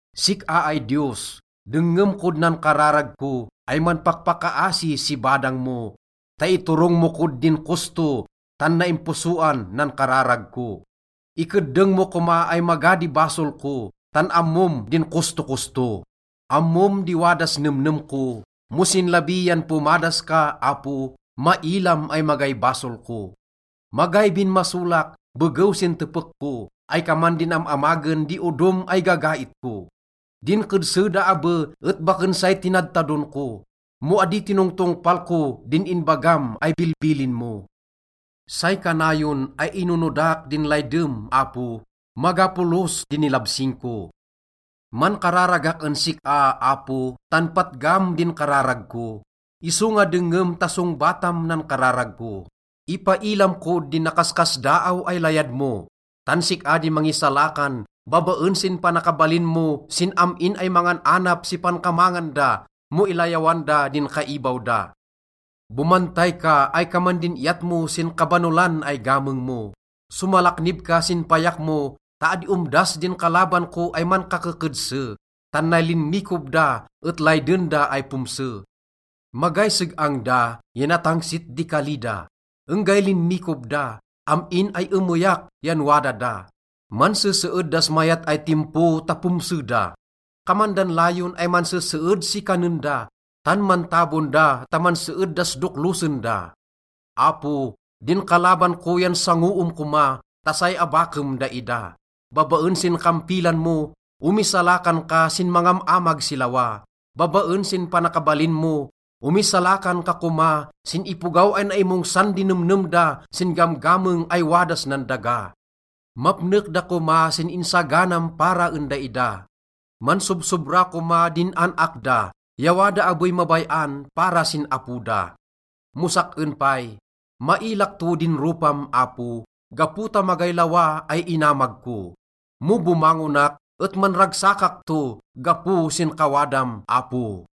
Sik-a ay Diyos, dengngem kod nan kararag ko ay manpakpakaasi si badang mo ta iturong mo kod din kosto, tan naimposoan nan kararag ko. Ikeddeng mo koma ay maga di basol ko, tan ammom din kostokosto. Ammom di wadas nemnem ko. Mo sin labi yan pomadas ka, Apo, mailam ay magay basol ko. Magay binmasolak begew sin tepek ko, ay kaman din am-amagen di odom ay gagait ko. Din kedse da abe et baken say tinadtadon ko, mo adi tinongtongpal ko din inbagam ay bilbilin mo. Say kanayon ay inonodak din laydem, Apo, maga polos di nilabsing ko. Mankararagak en sik-a, Apo, tan patgam din kararag ko, isonga dengngem ta songbatam nan kararag ko. Ipailam kod din nakaskasdaaw ay layad mo, tan sik-a di mangisalakan babaen sin panakabalin mo sin am-in ay mangan-anap si pankamangan da mo ilayawan da din kaibaw da. Bomantay ka ay kaman din iyat mo sin kabanolan ay gameng mo. Somalaknib ka sin payak mo ta adi omdas din kalaban ko ay mankakekedse, tan nay linmikob da et layden da ay pomse. Magay seg-ang da ya natangsit di kali da. Enggay linmikob da, am-in ay emeyak yan wada da. Manseseed das mayat ay timpo ta pomse da. Kaman dan layon ay manseseed si kanen da, tan mantabon da ta manseed das doklosen da. Apo, din kalaban ko yan sangoem koma ta say abakem daida. Babaen sin kampilan mo, omisalakan ka sin mangam-amag si lawa. Babaen sin panakabalin mo, omisalakan ka koma sin ipogaw ay naimongsan di nemnem da sin gamgameng ay wadas nan daga. Mapnek da koma sin insaganam para en daida. Mansobsobra koma din an-ak da, ya wada abey mabay-an para sin apo da. Mo sak-en pay, mailak to din ropam, Apo, gapo ta magay lawa ay inamag ko. Mo bomangonak et manragsakak to gapo sin kawadam, Apo.